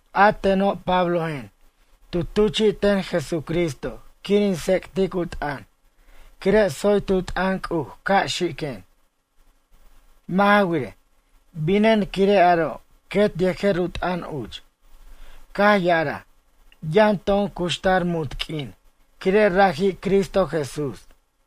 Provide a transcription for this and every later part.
A teno' Pablojen tu tuchi'ten Jesucristo quir in tsec'tic u t'ʌn quire' tsoy tu t'ʌn C'uj ca' xiquen. Mʌ' ja wirej, binen quire' aro' quet yejer u t'ʌn uch. Caj ya'araj, yʌn to'on cuxtar munt q'uin quire' raji' Cristo Jesús.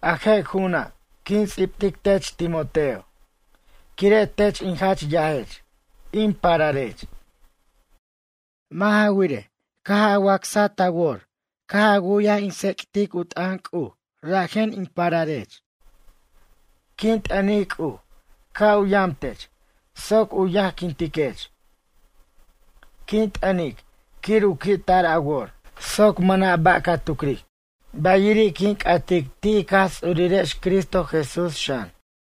A je' ju'una' quin ts'ibtic tech Timoteo, quire' tech in jach yajech, in pararech. Mʌ' ja wirej, caj a wacsaj ta wor caj a wu'yaj in tsec't u t'ʌn C'uj rajen in pararech. Quin t'ʌnic C'uj ca' u yam tech soc u yajquintiquech. Quin t'ʌnic quir u qui'tar a wor soc mʌna' ba' ca tucric. Bayiri' quin c'atic ti' ic Jaj Ts'urirex Cristo Jesús xan.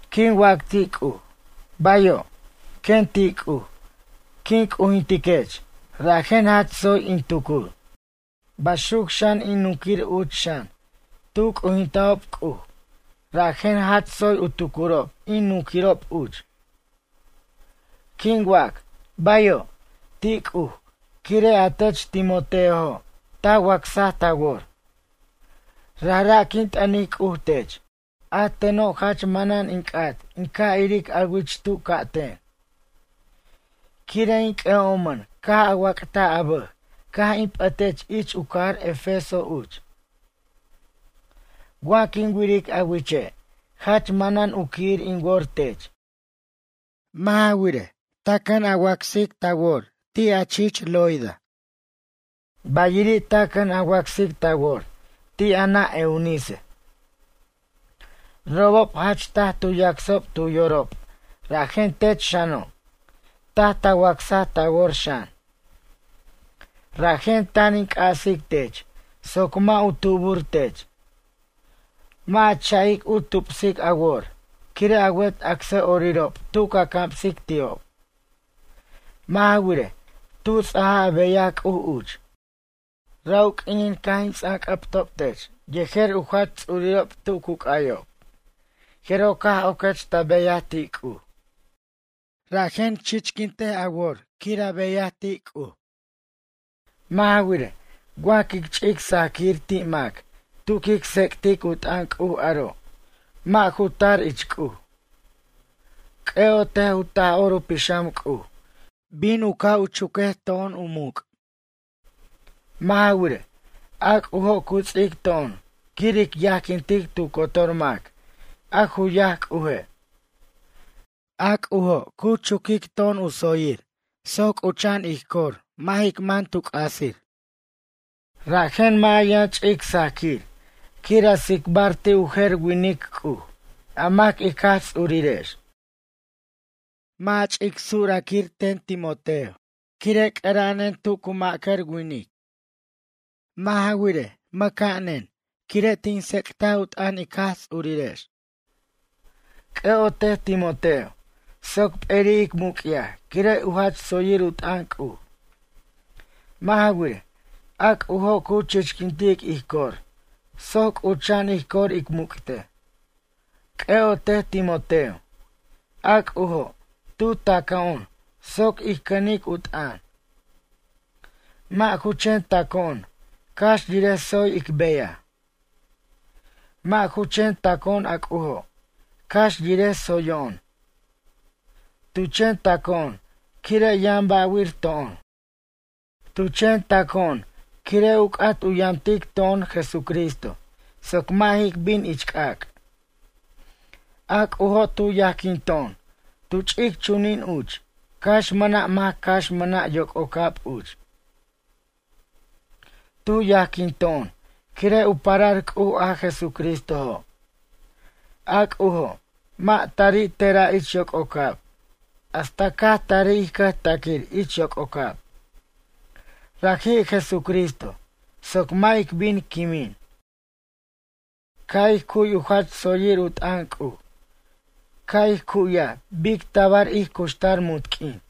Quin wac ti' C'uj: “Bayo'”, quen ti' C'uj quin c'ujintiquech rajen jach tsoy in tucur. Baxuc xan in nunquir uch xan tu c'ujintajob C'uj rajen jach tsoy u tucurob in nunquir uch. Quin wac “bayo'” ti' C'uj quire' a tech Timoteojo' ta wacsaj ta wor. Rajra' quin t'ʌnic C'uj tech. A teno' jach manan in c'at in ca' iric a wich tu ca'ten. Quire' in c'ʌ'omʌn caj a wac'taj a bʌj caj in p'ʌtech ich u cajar Efeso uch. Wa quin wiric a wiche', jach manan u qui'ir in wor tech. Mʌ' ja wirej, taj ta cʌn a wacsic ta wor ti' a chich Loida. Bayiri' ta cʌn a wacsic ta wor ti' a nʌ' Eunice. Robob jach taj tu yacsob tu yorob rajen tech xano' taj ta wacsaj ta wor xan. Rajen tan in c'asic tech soc mʌ' u tubur tech. Mʌ' a cha'ic u tupsic a wor quire' a wet acsʌ'orirob tu ca camsic ti'ob. Mʌ' ja wirej, tu ts'aja a beyaj C'uj uch. Ra' u q'uinin caj in ts'anc'ʌbtob tech ten yejer u jach ts'urirob tu cu c'ayob jeroj caj oquech ta beyaj ti' C'uj. Rajen chichquint a wor quir a beyaj ti' C'uj. Mʌ' ja wirej, wa quic ch'ic sajaquir ti' mac tu quic tsec'tic u t'ʌn C'uj aro' mʌ' ju tar ich C'uj. C'ʌ'otej u Taj'or u Pixam C'uj bin u ca' u chuquej to'on u muc'. Mʌ' ja wirej, a C'ujo' cu ts'ic to'on quir ic yajquintic tu cotor mac a ju yaj C'uje'. A C'ujo' cu chuquic to'on u tsoyir soc c'ucha'an ij cor mʌ' jic man tu c'asir. Rajen mʌ' a yʌn ch'ic sajquir quir a tsicbar ti' u jer winic C'uj a mac ic Jaj Ts'urirex. Mʌ' ja ch'ic surquir ten Timoteo, quire' c'ʌra'anen tu cu ma'cʌr winic. Mʌ' ja wirej, mʌca'anen quire' tin tsec't u t'ʌn ic Jaj Ts'urirex. C'ʌ'otej Timoteo, soc p'eri' ic muc'yaj quire' u jach tsoyir u t'ʌn C'uj. Mʌ' ja wirej, a C'ujo' cu chichquintic ij cor soc c'ucha'an ij cor ic muc'tej. C'ʌ'otej Timoteo, a C'ujo', tu ta'co'on soc ij cʌnic u t'ʌn. Mʌ' ju chen ta'co'on cax yirej tsoy ic beyaj. Mʌ' ju chen taco'on a C'ujo', cax yirej tsoyo'on. Tu chen taco'on quire' yʌn ba'wir to'on. Tu chen taco'on quire' u c'at u yamtic to'on Jesucristo, soc mʌ' jic bin ich c'ac'. A C'ujo' tu yajquinto'on tu ch'ic chunin uch cax mʌna' mac cax mʌna' yoc'ocab uch. Tu yajquinto'on quire' u parar C'uj a Jesucristojo'. A C'ujo', mʌ' tari te'ra' ich yoc'ocab hasta caj tarij ij cʌjtaquir ich yoc'ocab. Raji' Jesucristo, soc mʌ' ic bin quimin. Caj ij cu'y u jach tsoyir u t'ʌn C'uj, caj ij cu'ya bic tabar ij cuxtar munt q'uin.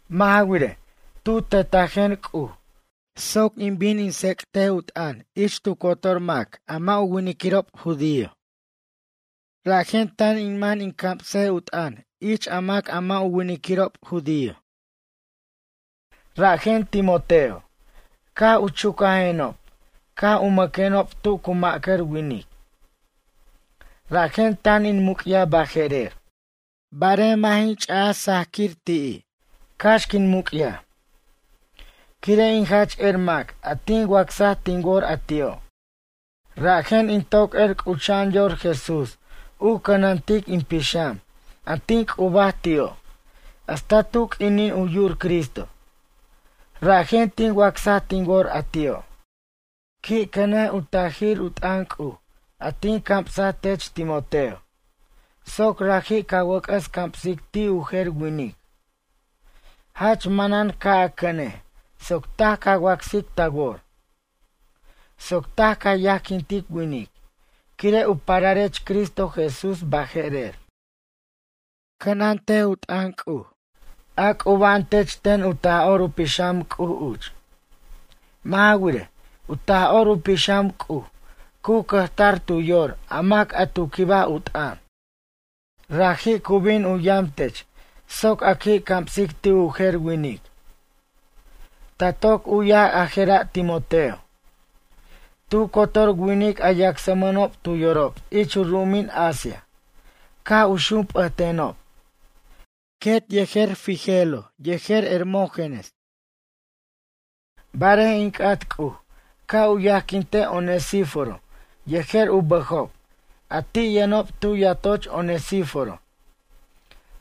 Mʌ' ja wirej, tu tetajen C'uj soc in bin in tsec't u t'ʌn ich tu cotor mac a mʌ' u winiquirob judío. Rajen tan in man in cams u t'ʌn ich a mac a mʌ' u winiquirob judío. Rajen Timoteo, caj u chucajenob ca' u mʌquenob tu cu ma'cʌr winic. Rajen tan in muc'yaj baje'rer. Barej mʌ' jin ch'aj sajaquir ti'i' cax quin muc'yaj. Quire' in jach er a mac a tin wacsaj tin wor a ti'o'. Rajen in toc er c'ucha'an yor Jesús u cʌnantic in pixam a tin c'ubaj ti'o' hasta tu q'uinin u yu'ur Cristo. Rajen tin wacsaj tin wor a ti'o'. Qui' cʌnej u tajir t'ʌn C'uj a tin camsaj tech Timoteo, soc raji' ca wʌc'ʌs camsic ti' u jer winic. Jach manan ca' a cʌnej soc taj ca wacsic ta wor. Soc taj ca yajquintic winic quire' u pararech Cristo Jesús baje'rer. Cʌnʌt u t'ʌn C'uj, a c'uba'an tech ten u Taj'or u Pixam C'ujo' uch. Mʌ' ja wirej, u Taj'or u Pixam C'uj cu cʌjtar tu yor a mac a tu quibaj u t'ʌn. Raji' cu bin u yam tech soc a qui' camsic ti' u jer winic. Ta toc u'yaj a jera' Timoteo. Tu cotor winic a yacsmʌnob tu yorob ich u ru'umin Asia caj u xump'ʌtenob. Quet yejer Figelo yejer Hermógenes. Barej in c'at C'uj ca' u yajquinte Onesíforo yejer u bʌjob a ti' yʌnob tu yatoch Onesíforo,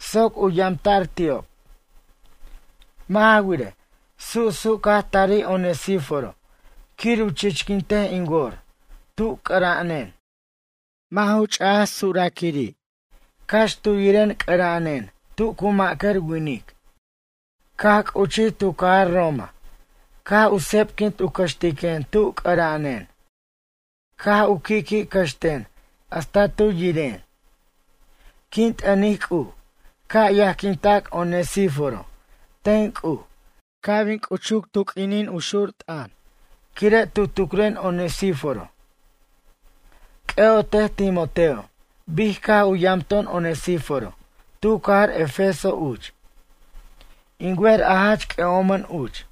soc u yamta'r ti'ob. Mʌ' ja wirej, susu' caj tarij Onesíforo quir u chichquintej in wor tu c'ʌra'anen. Mʌ' ju ch'aj sujraquiri' cax tu yiren c'ʌra'anen tu cu ma'cʌr winic. Caj c'uchij tu cajar Roma caj u sebquint u cʌxtiquen tu c'ʌra'anen. Caj u qui'qui' cʌxten hasta tu yiren. Quin t'ʌnic C'uj ca' yajquinta'c Onesíforo ten C'uj ca' bin c'uchuc tu q'uinin xur t'ʌn quire' tu tucren Onesíforo. C'ʌ'otej Timoteo bic caj u yamto'on Onesíforo tu cajar Efeso uch. In wer a jach c'ʌ'omʌn uch.